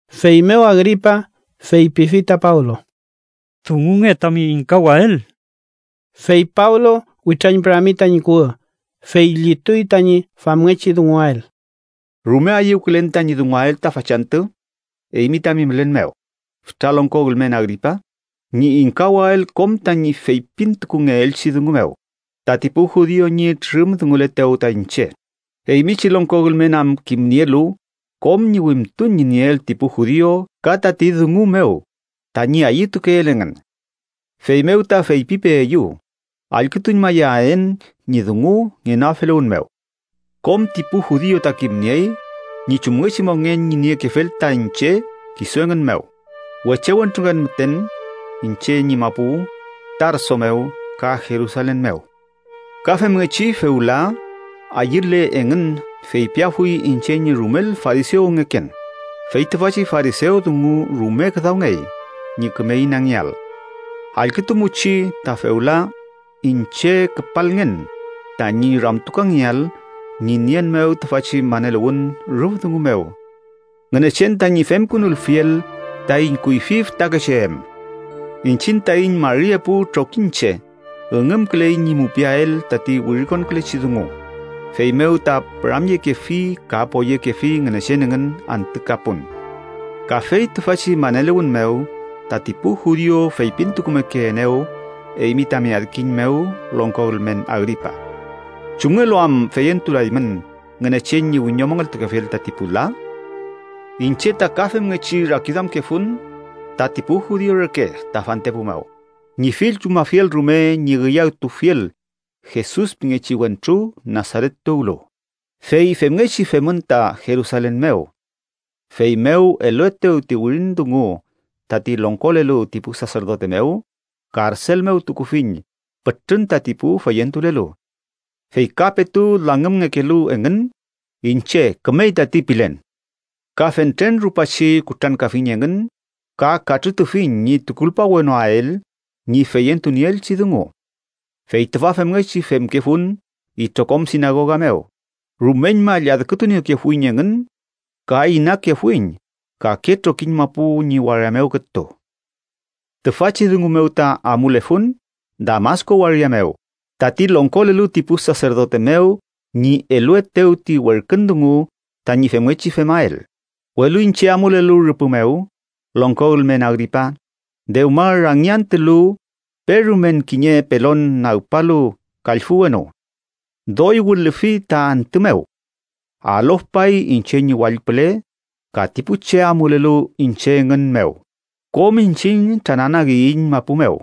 Feymew Agripa feypifi ta Pablo: —Dungunge tami ingkawael. Fey Pablo witrañpürami tañi kuwü, fey llituy tañi famngechi dunguael: “Rume ayüwkülen tañi dunguael ta fachantü eymi tami mülen mew, fütra longko ülmen Agripa, ñi ingkawael kom tañi feypintukungeelchi dungu mew tati pu judiu ñi trürümdunguletew ta iñche, eymi chi longko ülmen am kimnielu kom ñi wimtun ñi nieel ti pu judiu ka tati dungu mew tañi ayütukeel engün. Feymew ta feypipeeyu allkütuñmayaen ñi dungu ngenoafeluwün mew. “Kom ti pu judiu ta kimniey ñi chumngechi mongen ñi niekefel ta iñche kisu engün mew, weche wentrungen müten iñche ñi mapu Tarso mew ka Jerusalen mew. Ka femngechi fewla, ayüle engün, feypiafuy iñche ñi rumel farisewngeken, fey tüfachi farisew dungu rume küdawngey ñi küme inangeael. Allkütumuchi, ta fewla iñche küpalngen tañi ramtukangeael ñi nien mew tüfachi maneluwün rüf dungu mew Ngünechen tañi femkünulfiel taiñ kuyfi fütakeche em. Iñchiñ taiñ mari epu trokiñche üngümküley ñi mupiael tati wirikonkülechi dungu, feymew ta püramyekefi ka poyekefi Ngünechen engün antü ka pun. Kafey tüfachi maneluwün mew, tati pu judiu feypintukumekeenew eymi tami adkiñ mew longko ülmen Agripa. ¿Chumngelu am feyentulaymün Ngünechen ñi wiñomongeltukefiel tati pu la? “Iñche ta ka femngechi rakiduamkefun tati pu judiu reke ta fantepu mew, ñi fill chumafiel rume ñi üyawtufiel Jesus pingechi wentru Nasaret tuwlu, fey femngechi femün ta Jerusalen mew. Feymew eluetew ti wirin dungu tati longkolelu ti pu saserdote mew, karsel mew tukufiñ pütrün tati pu feyentulelu. Fey ka petu langümngekelu engün, iñche ‘kümey tati’ pilen. Ka fentren rupachi kutrankafiñ engün ka katrütufiñ ñi tukulpawnoael ñi feyentunieelchi dungu. Fey tüfa femngechi femkefun itrokom sinagoga mew, rumeñma lladkütuniekefuiñ engün ka inakefuiñ kake trokiñ mapu ñi waria mew kütu. “Tüfachi dungu mew ta amulefun Damasku waria mew tati longkolelu ti pu saserdote mew ñi eluetew ti werkün dungu tañi femngechi femael. Welu iñche amulelu rüpü mew, longko ülmen Agripa, dewma rangi antülu, perumen kiñe pelon nagpalu kallfü wenu. Doy wilüfi ta antü mew. Alofpay iñche ñi wall püle ka ti pu che amulelu iñche engün mew. Kom iñchiñ trananagiyiñ mapu mew,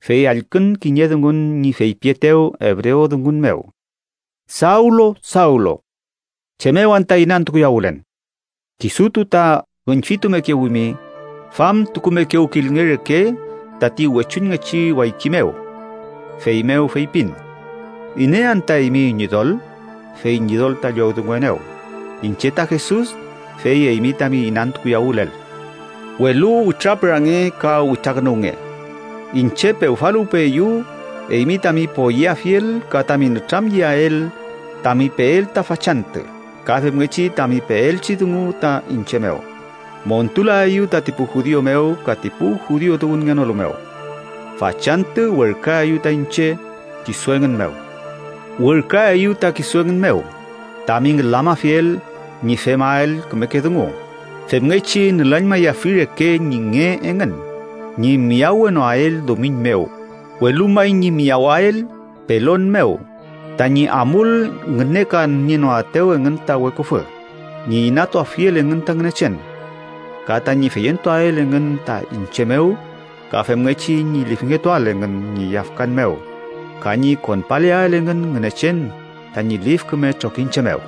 fey allkün kiñe dungun ñi feypietew ebrewdungun mew: ‘Sawlu, Sawlu, ¿chem mew anta inantukuyawülen? Kisutu ta üñfitumekewimi, famtukumekewkilnge reke tati wechuñngechi wayki mew.’ Feymew feypin: ‘¿Iney anta eymi Ñidol?’ fey Ñidol ta llowdunguenew: ‘Iñche ta Jesus fey eymi tami inantukuyawülel. Welu witrapürange, ka witrakünuwnge, iñche pewfaluwpeeyu eymi tami poyeafiel ka tami nütramyeael tami peel ta fachantü ka femngechi tami peaelchi dungu ta iñche mew. Montulaeyu tati pu judiu mew ka tati pu judiu tuwünngenolu mew. Fachantü werküaeyu ta iñche kisu engün mew. Werküaeyu ta kisu engün mew tami ngülamafiel ñi femael kümeke dungu femngechi nülañmayafi reke ñi nge engün ñi miyawenoael dumiñ mew, welu may ñi miyawael pelon mew tañi amul ngünekanienoaetew engün ta weküfü, ñi inatuafiel engün ta Ngünechen. Ka tañi feyentuael engün ta iñche mew ka femngechi ñi lifngetuael engün ñi yafkan mew ka ñi konpaleael engün Ngünechen tañi lif küme trokiñche mew.’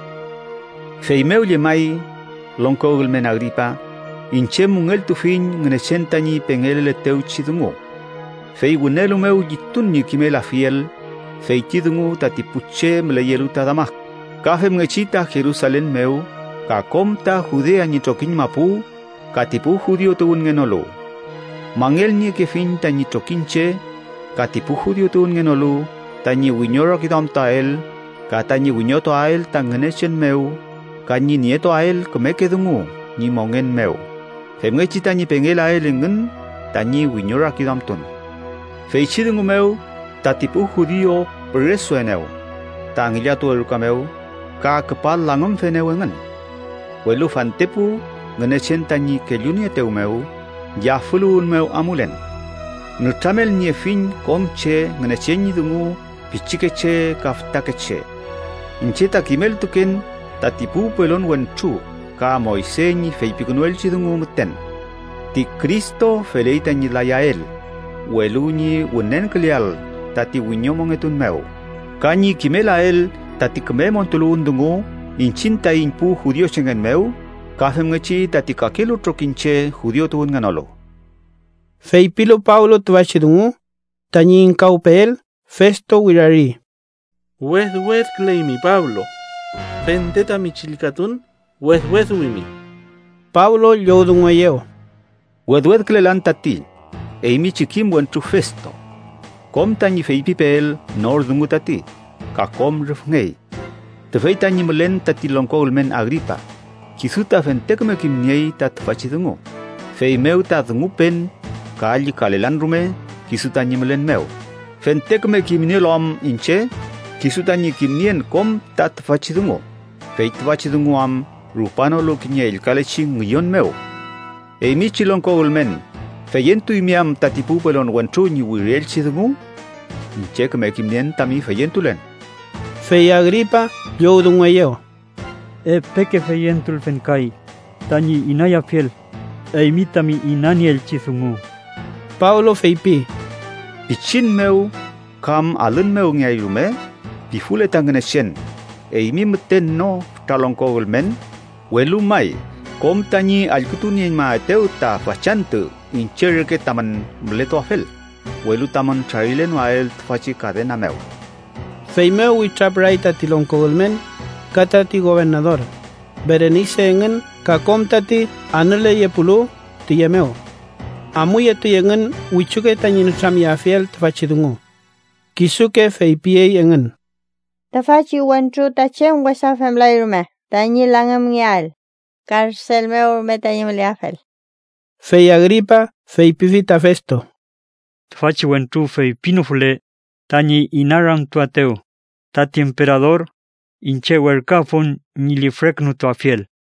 “Feymew llemay, longko ülmen Agripa, iñche müngeltufiñ Ngünechen tañi pengeleletewchi dungu. Fey wünelu mew llitun ñi kimelafiel feyti dungu tati pu che müleyelu ta Damasku, ka femngechi ta Jerusalen mew ka kom ta Judea ñi trokiñ mapu, ka ti pu judiu tuwünngenolu. Mangelniekefiñ tañi trokiñche, ka ti pu judiu tuwünngenolu tañi wiñorakiduamtuael, ka tañi wiñotuael ta Ngünechen mew ka ñi nietuael kümeke dungu ñi mongen mew, femngechi tañi pengelael engün tañi wiñorakiduamtun. Feychi dungu mew, tati pu judiu püresuenew ta ngillatuwe ruka mew ka küpa langümfenew engün. Welu fantepu Ngünechen tañi kellunieetew mew, yafüluwün mew amulen. Nütramelniefiñ kom che Ngünechen ñi dungu, pichikeche ka fütakeche. Iñche ta kimeltuken tati pu pelon wentru ka Moyse ñi feypikünuelchi dungu müten: Ti Cristo feley tañi layael, welu ñi wünenküleael tati wiñomongetun mew, ka ñi kimelael tati küme montuluwün dungu iñchiñ taiñ pu judiuchengen mew ka femngechi tati kakelu trokiñche, judiu tuwünngenolu.” Feypilu Pablo tüfachi dungu tañi ingkawpeel, Festo wirari: —¡Wedwedküleymi, Pablo! Fente tami chillkatun wedweduwimi. Pablo llowdungueyew: —Wedwedkülelan tati, eymi chi kim wentru Festo. Kom tañi feypipeel nor dungu tati ka kom rüfngey. Tüfey tañi mülen tati longko ülmen Agripa, kisu ta fente küme kimniey ta tüfachi dungu, feymew ta dungupen ka llükalelan rume kisu tañi mülen mew, fente küme kimnielu am iñche kisu tañi kimnien kom ta tüfachi dungu, fey tüfachi dungu am rupanolu kiñe ellkalechi ngüyon mew. Eymi chi longko ülmen, ¿feyentuymi am tati pu pelon wentru ñi wirielchi dungu? Iñche küme kimnien tami feyentulen. Fey Agripa llowdungueyew: —Epeke feyentulfen kay tañi inayafiel eymi tami inanieelchi dungu. Pablo feypi: —Pichin mew kam alün mew ngeay rume, pifule ta Ngünechen, eymi müten no fütra longko ülmen, welu may kom tañi allkütunieñmaetew ta fachantü iñche reke tamün mületuafel, welu tamün trarilenoael tüfachi kadena mew. Feymew witrapüray tati longko ülmen, ka tati gobernador, Berenise engün ka kom tati anüleyepulu tüye mew. Amuyetuy engün wichuke tañi nütramyeafiel tüfachi dungu. Kisuke feypiyey engün: —Tüfachi wentru ta chem wesa femlay rume tañi langümngeael, karsel mew rume tañi müleafel. Fey Agripa feypifi ta Festo: —Tüfachi wentru feypinofule tañi inaramtuaetew tati emperador, iñche werküafun ñi lifrekünutuafiel.